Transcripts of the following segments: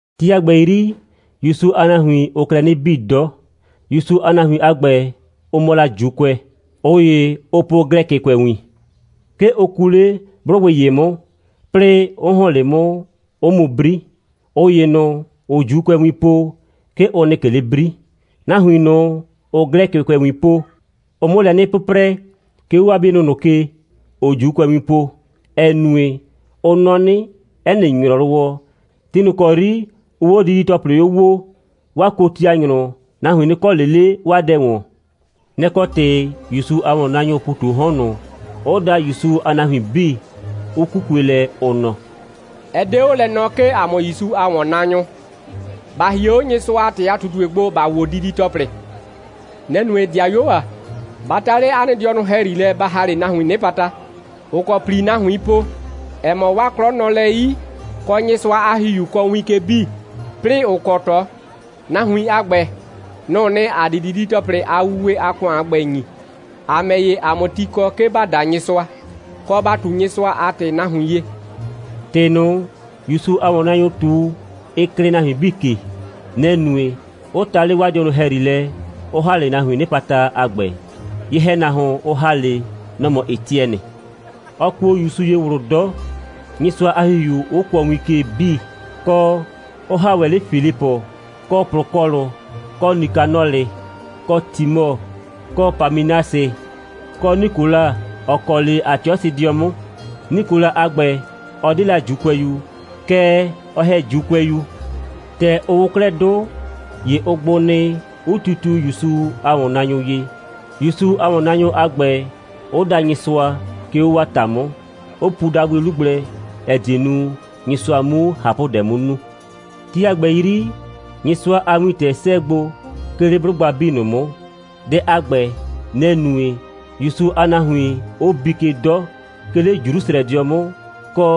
Ti a ‑gbɛ 'yri, ‑Yusu a nahuin, ʋʋ klɛ 'nɩ bii 'dɔ. ‑Yusu a nahuin a ‑gbɛ, ʋ mɔ la ‑Juukʋɛ. ꞊Ʋ ‑ye, ʋʋ po Glɛkɩkʋɛwin. 'Ke ʋ kuu 'le 'blʋgbɩ ‑ye 'mʋ, 'plɩɩ 'ʋ ‑hɔn 'le 'mʋ, 'ʋ mu 'bri; ꞊ʋ ‑ye ꞊nʋ, ‑ʋʋ ‑Juukʋɛwin po, 'ke ʋ nɩ ꞊ke 'le 'bri. Nahuin ꞊nʋ, ‑ʋʋ Glɛkɩkʋɛwin po, ʋʋ 'mʋ lɛ 'nɩ 'pʋprɛ, 'ke 'o 'waa 'bienʋ ꞊nʋ ke, ‑ʋʋ ‑Juukʋɛwin po, ‑ɛ nue, ʋ nɔ 'nɩ, 'ɛ nɩ ‑nyrɔwɔ, ti ꞊nʋ ‑kɔ 'yri ʋʋ 'o didi‑tɔplɩ 'o woo, 'waa kotianyrʋ, nahuin 'nɩ kɔ ꞊le 'le 'waa dɛ ‑wɔn. Nɛ‑ kɔ ‑tɩ ‑Yusu a ‑wɔnnaanyʋʋ ‑pu ꞊tu 'o 'hɔn ꞊nʋ, 'ʋ da ‑Yusu a nahuin 'bii, 'ʋ 'kukue lɛ, ʋ nɔ: «Ɛ 'de 'o lɛ nɔɔ, 'ke ‑a mʋ ‑Yusu a ‑wɔnnaanyʋ ‑ba hie 'o Nyɩsʋa a ‑tɩ a ꞊tutue gbo, ‑ba wo didi‑tɔplɩ. Nɛ‑ nue, ‑dɩayuo ‑a, ba ta 'le 'a nɩ dɩɔnʋ ‑hɛyri lɛ, ba ‑ha 'le nahuiin 'nɩpata, ‑ʋ kɔ ‑pli nahuiin po, ‑ɛ mɔ, 'waa 'klɔ nɔ lɛ 'yi, kɔ, Nyɩsʋa a ‑Hihiu kɔɔ win ke 'bii, 'plɩɩ, ‑ʋ kɔ ꞊tɔ. Nahuin a ‑gbɛ, nʋ‑ʋ nɩ, ‑a di didi‑tɔplɩ a wuwe a ‑kʋan a ‑gbɛ ‑nyi, ‑a ‑mɛ ‑ye, ‑a 'mʋ ti kɔ, 'ke ‑ba da Nyɩsʋa, kɔ, ‑ba ꞊tu Nyɩsʋa a ‑tɩ nahuin ye.» ‑Tɩ ꞊nʋ, ‑Yusu a ‑wɔnnaanyʋ ꞊tu, ɩ klɩɩ nahuin 'bii ke. Nɛ‑ nue, 'ʋ ta 'le 'waa dɩɔnʋ ‑hɛyri lɛ, 'ʋ ‑ha 'le nahuiin 'nɩpata a ‑gbɛ. Ye‑hɛnahuon, ʋ ‑ha 'le, nɔ‑ mɔ Etiɛnɩ. Ɔ kuo ‑Yusu ye ꞊wlʋ 'dɔ, Nyɩsʋa a ‑Hihiu 'ʋ kʋɔ win ke 'bii, kɔ, 'ʋ ‑ha ‑wɛ 'le Filipʋ, kɔ Plʋkɔɔlʋ, kɔ Nikanɔlɩ, kɔ Timɔ, kɔ Pamɩnasɩ, kɔ Nikola, ‑ɔ kɔ 'le Atiɔsɩdɩɔ 'mʋ. Nikola a ‑gbɛ, ɔ 'de la ‑Juukʋɛyu, kɛɛ, ɔ ‑hɛ ‑Juukʋɛyu. ‑Tɛ ʋ wʋ 'klɛɛ 'dʋ, ‑ye ʋ gbʋ nɩ, 'ʋ titiu ‑Yusu a ‑wɔnnaanyʋ ye, ‑Yusu a ‑wɔnnaanyʋ a ‑gbɛ 'ʋ da Nyɩsʋa, 'ke 'o 'waa ‑ta 'mʋ, 'ʋ pu dabʋɩ 'lu gblɛ, ‑ɛ die nu, Nyɩsʋa 'mu ꞊hapʋdɛ 'mʋ nu. Ti a ‑gbɛ 'yri, Nyɩsʋa a wintɛ 'sɛɛ gbo, 'ke 'le 'blʋgba 'bii ꞊nʋ 'mʋ. Dɛ a ‑gbɛ, nɛ‑ nue, ‑Yusu a nahuin 'ʋ bii ke 'dɔ, 'ke 'le Jrusrɛdɩɔ 'mʋ, kɔ,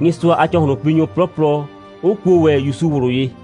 Nyɩsʋa a ‑cɔhlʋnpinyʋ 'plɔplɔ 'ʋ kuo ‑wɛ ‑Yusu ꞊wlʋ ye.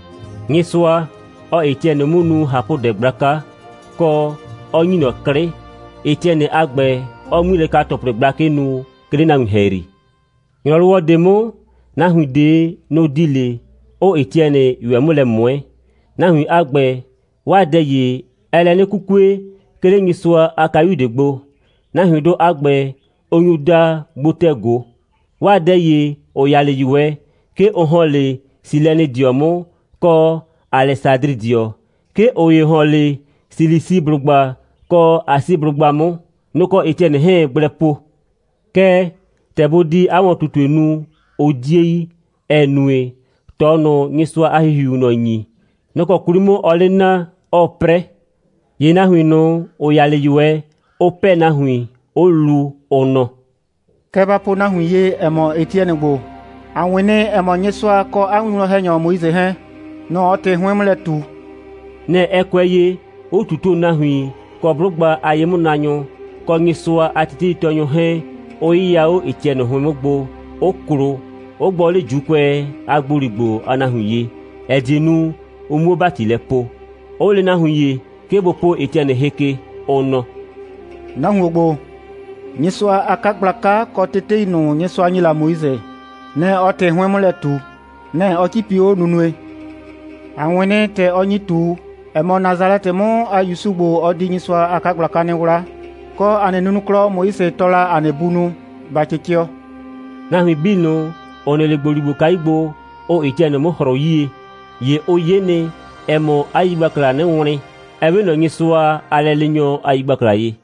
Nyɩsʋa, ɔɔ Etiɛnɩ 'mʋ nu ꞊hapʋdɛ gblaka, kɔ, 'ɔ ‑nyi ꞊nɔ 'klɩ, Etiɛnɩ a ‑gbɛ 'ɔɔ 'ŋmilɛka‑tɔplɩ gblakɩ nu, 'ke 'le nahuin ‑hɛyri. ‑Nyrɔwɔ ꞊de 'mʋ, nahuin ꞊de, nʋ‑ di 'le, 'ʋʋ Etiɛnɩ ꞊yʋɛ 'mʋ lɛ ꞊mʋɛ. Nahuin a ‑gbɛ, 'waa dɛ ‑ye, ɛɛ lɛ 'nɩ 'kukue, 'ke 'le Nyɩsʋa a kayu ꞊de gbo. Nahuindʋ a ‑gbɛ, ʋ nyu daa gbotɛ꞊go. 'Waa dɛ ‑ye, ‑ʋ ya 'le ꞊yʋɛ, 'ke ʋ ‑hɔn 'le Silɛnɩdɩɔ 'mʋ, kɔ Alɛsadrɩdɩɔ, 'ke ꞊ʋ ‑ye ‑hɔn 'le Silisiblʋgba kɔ Asiblʋgba 'mʋ. Nʋ‑ kɔ Etiɛnɩ 'hɛɛn‑ gblɛ po. Kɛɛ, ‑tɛ bʋ di 'a ‑wɔn꞊tutue nu, ʋ 'die yi, ‑ɛ nue, ꞊tɔ ꞊nʋ, Nyɩsʋa a ‑Hihiuu ꞊nɔ ‑nyi, nɔ‑ kɔ 'kwli 'mʋ ɔɔ 'le naa, 'ɔɔ 'prɛ. ‑Ye nahuin ꞊nʋ, ‑ʋ ya 'le ꞊yʋɛ, ʋ 'pɛɛ nahuin, 'ʋ lu, ʋ nɔ: «Kɛ ba po nahuin ye, ‑ɛ mɔ, Etiɛnɩ ‑gbo, a 'wɩn nɩ, ‑ɛ mɔ, Nyɩsʋa kɔ 'a winwlɔn‑hɛnyɔ Moise 'hɛɛn, nʋ‑ ɔɔ ‑tɩ 'hʋɩn 'mʋ lɛ ꞊tu.» Nɛ‑ ɛ kʋɛ ye, 'ʋ ꞊tutuo nahuin kɔ 'blʋgba a ye'mʋnaanyʋ, kɔ Nyɩsʋa a teteitɔɔnyʋ 'hɛɛn, 'ʋ 'yɩya 'o Etiɛnɩ 'hʋɩn 'mʋ gbo, 'ʋ klo, 'ʋ gbɔ 'le ‑Juukʋɛ a ‑gboligbo a nahuin ye, ‑ɛ die nu, ʋ 'muo ‑bati lɛ poo, 'ʋ lee nahuin ‑ye, 'ke bʋ po Etiɛnɩ hɩ ke, ʋ nɔ: «Nahuon ‑gbo, Nyɩsʋa a 'kagblaka kɔ tetei ꞊nʋ, Nyɩsʋa ‑nyi la Moise, nɩ‑ ɔɔ ‑tɩ ‑hʋɩn 'hʋɩn 'mʋ lɛ ꞊tu. Nɛ‑ ɔ 'cipi 'o nunue. ‑A 'wɩn nɩ, ‑tɛ ɔ nyi ꞊tu, ‑ɛ mɔ, Nasalɛtɩ 'mʋ a ‑Yusu ‑gbo, ɔ di Nyɩsʋa a 'kagblaka 'nɩ 'wla, kɔ, ‑a nɩ nunuklɔ, Moise tɔɔ la ‑a nɩ bunʋ, ‑ba 'cɩcɩɔ.» Nahuin 'bii ꞊nʋ, ‑ʋ nɩ 'le ‑gboligbokayu gbo, ʋʋ Etiɛnɩ 'mʋ ‑hrʋʋ 'yie, ‑ye ʋ 'ye nɩ, ‑ɛ mɔ, 'a yigbaklaa 'nɩ wlɩn, ‑ɛ 'we ꞊nɔ Nyɩsʋa a lɛleenyɔ a yigbakla ye.